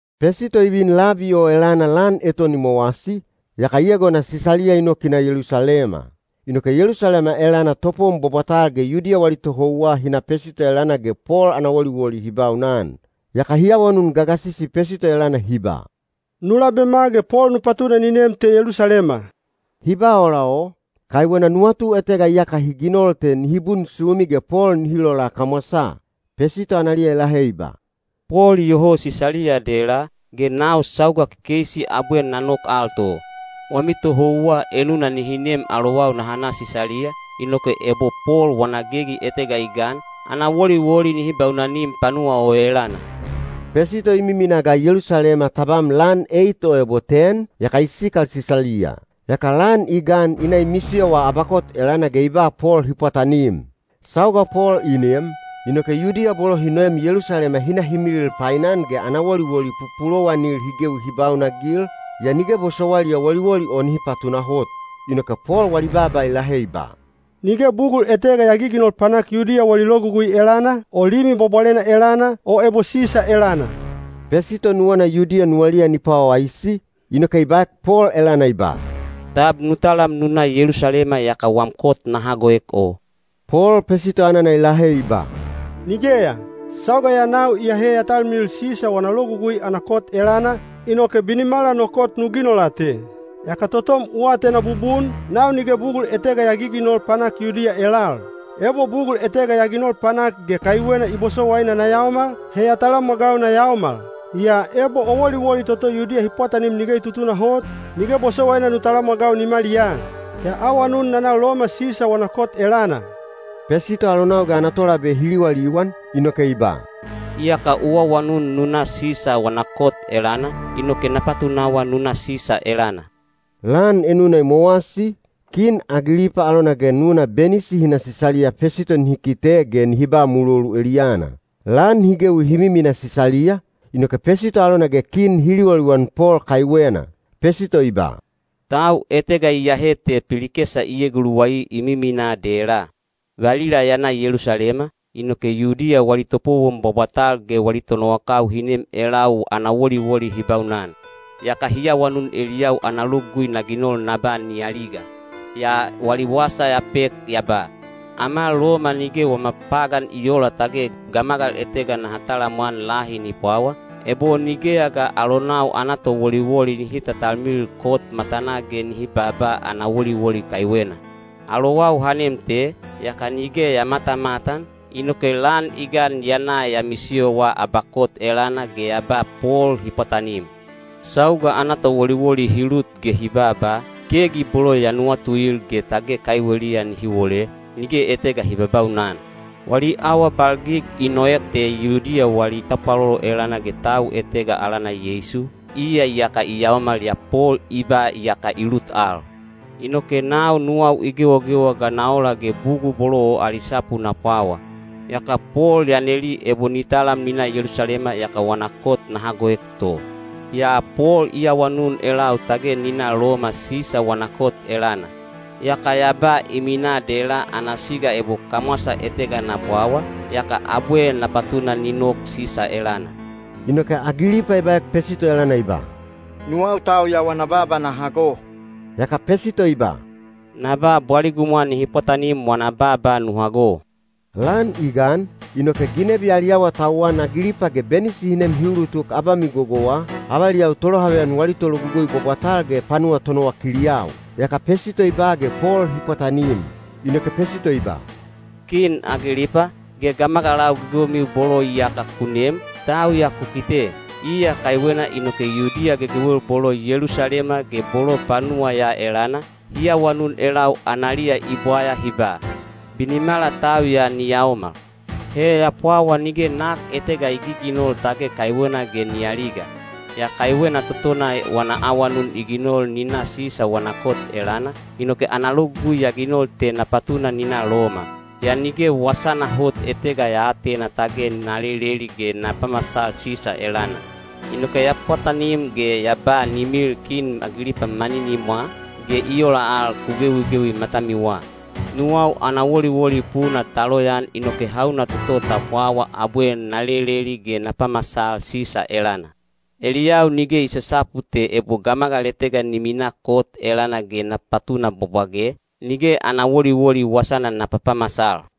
Pesito i vin labi o elana lan eton i mowasi, yaka i egona Sisaliya i nok i na Yelusalema. Inoke Yelusalema elana topowon bwabwatal ge Yudiya wali tohouwa hi na Pesito elana ge Pol ana woliwoli hi baunan. Yaka hi awanun gagasisi Pesito elana hi ba, “Nu labema ge Pol nu patuna ni nem te Yelusalema.” Hi ba ola o, kaiwena nuwatu etega iyaka hi ginol te nihi bunsumi ge Pol nihi lola kamwasaa. Pesito analiya i lahe i ba, “Pol iyoho Sisaliya dela, ge nau sauga kekeisi abwe na nok al to. Wami tohouwa enuna nihi nem alowau naha na Sisaliya, inoke ebo Pol wana gegi etega i gan, ana woliwoli nihi baunanim panuwa o elana.” Pesito i miminaa ga Yelusalema tabam lan eit o ebo ten, yaka i sikal Sisaliya. Yaka lan i gan i na i misiyowa abakot elana ge i ba Pol hi pwatanim. Sauga Pol i nem, inoke Yudiya bolo hi noem Yelusalema hi na hi milil painan ge ana woliwoli pupulowanil hi gewi hi baunanagil, yaa nige bosowailiya woliwoli o nihi patunahot. Inoke Pol wali baaba i lahe i ba, “Nige bugul etega ya giginol panak Yudiya wali logugui elana, o Limi Bwabwalena elana, o ebo Sisa elana.” Pesito nuwana Yudiya nuwaliya ni pwawaisi, inoke i baek Pol elana i ba, “Tab nu talam nu na Yelusalema yaka wam kot na hagoek o?” Pol Pesito anana i lahe i ba, “Nigeya! Sauga ya nau iyahe ya talmilil Sisa wana logugui ana kot elana, inoke binimala no kot nu ginola te. Yaka totom u atena bubun, nau nige bugul etega ya giginol panak Yudiya elal. Ebo bugul etega ya ginol panak ge kaiwena i bosowaina na yaomal, he ya talamwagau na yaomal. Yaa ebo o woliwoli toto Yudiya hi pwatanim nige i tutunahot, nige bosowaina nu talamwagau nimaliyaa. Ya awanun na na Loma Sisa wana kot elana.” Pesito alonau ge ana tolabe hi liwaliwan, inoke i ba, “Iyaka u awanun nu na Sisa wana kot elana, inoke na patunawa nu na Sisa elana.” Lan enuna i mowasi, Kin Agilipa alona ge nuna Benisi hi na Sisaliya Pesito nihi kite ge nihi ba mulolu eliyana. Lan hi gewi hi miminaa Sisaliya, inoke Pesito alona ge kin hi liwaliwan Pol kaiwena. Pesito i ba, “Tau etega iyahe te Pilikesa i eguluwai i miminaa dela. Valila ya na Yelusalema, inoke Yudiya wali topowon bwabwatal ge wali tonowakau hi nem elau ana woliwoli hi baunan. Yaka hi awanun eliyau ana logugui na ginol na ba ni aliga. “Yaa wali wasa ya pek ya ba, ‘Ama Loma nige wama pagan i oola tage gamagal etega naha talamwan lahi ni pwawa, ebo nigeya ga alonau ana towoliwoli nihi tatalmilil kot matanaa ge ni baaba ana woliwoli kaiwena.’ Alowau ha nem te, yaka nige ya matamatan, inoke lan i gan ya na ya misiyowa abakot elana ge ya ba Pol hi pwatanim. Sauga ana towoliwoli hi lut ge hi baaba, gegi bolo ya nuwatuil ge tage kaiweliya nihi wole, nige etega hi babaunan. Wali awabalgig i noek te Yudiya wali tapwalolo elana ge tau etega alana Yeisu, iya iyaka i yaomal yaa Pol i ba iyaka i lut al. Inoke nau nuwau i gewagewa ga na ola ge bugul bolo o ali sapu na pwawa. Yaka Pol ya neli ebo ni talam ni na Yelusalema yaka wana kot na hagoek to. Yaa Pol i awanun elau tage ni na Loma Sisa wana kot elana. Yaka ya ba i minaa dela ana siga ebo kamwasa etega na pwawa, yaka abwe na patuna ni nok Sisa elana.” Inoke Agilipa i baek Pesito elana i ba, “Nuwau tau ya wana baaba na hago.” Yaka Pesito i ba, “Na ba bwaligumwa nihi pwatanim wana baaba nu hago.” Lan i gan, inoke ginebi ali awatauwan Agilipa ge Benisi hi nem hi ulutuk abamigogowa, avaliyau tolohaveyan wali tologugui bwabwatal ge panuwa tonowakiliyau. Yaka Pesito i ba ge Pol hi pwatanim. Inoke Pesito i ba, “Kin Agilipa, ge gamagalau gegewemiu bolo iyaka ku nem, tau ya ku kite. Iya kaiwena inoke Yudiya gegewel bolo Yelusalema ge bolo panuwa ya elana, hi awanun elau analiya i bwaya hi ba, ‘Binimala tau ya ni yaomal.’ He ya pwawa nige nak etega i giginol tage kaiwena ge ni aliga. Yaa kaiwena totona wana awanun i ginol ni na Sisa wana kot elana, inoke ana logugui ya ginol te na patuna ni na Loma. Yaa nige wasana hot etega ya aatena tage na leleli ge na pamasal Sisa elana. Inoke ya pwatanim ge ya ba ni milil Kin Agilipa maninimwa, ge i ola al ku gewigewi matamiwa. Nuwau ana woliwoli puna ta loyaan inoke hauna toto ta pwawa abwe na leleli ge na pamasal Sisa elana. Eliyau nige i sasapu te ebo gamagal etega ni minaa kot elana ge na patuna bwabwage, nige ana woliwoli wasana na papamasal.”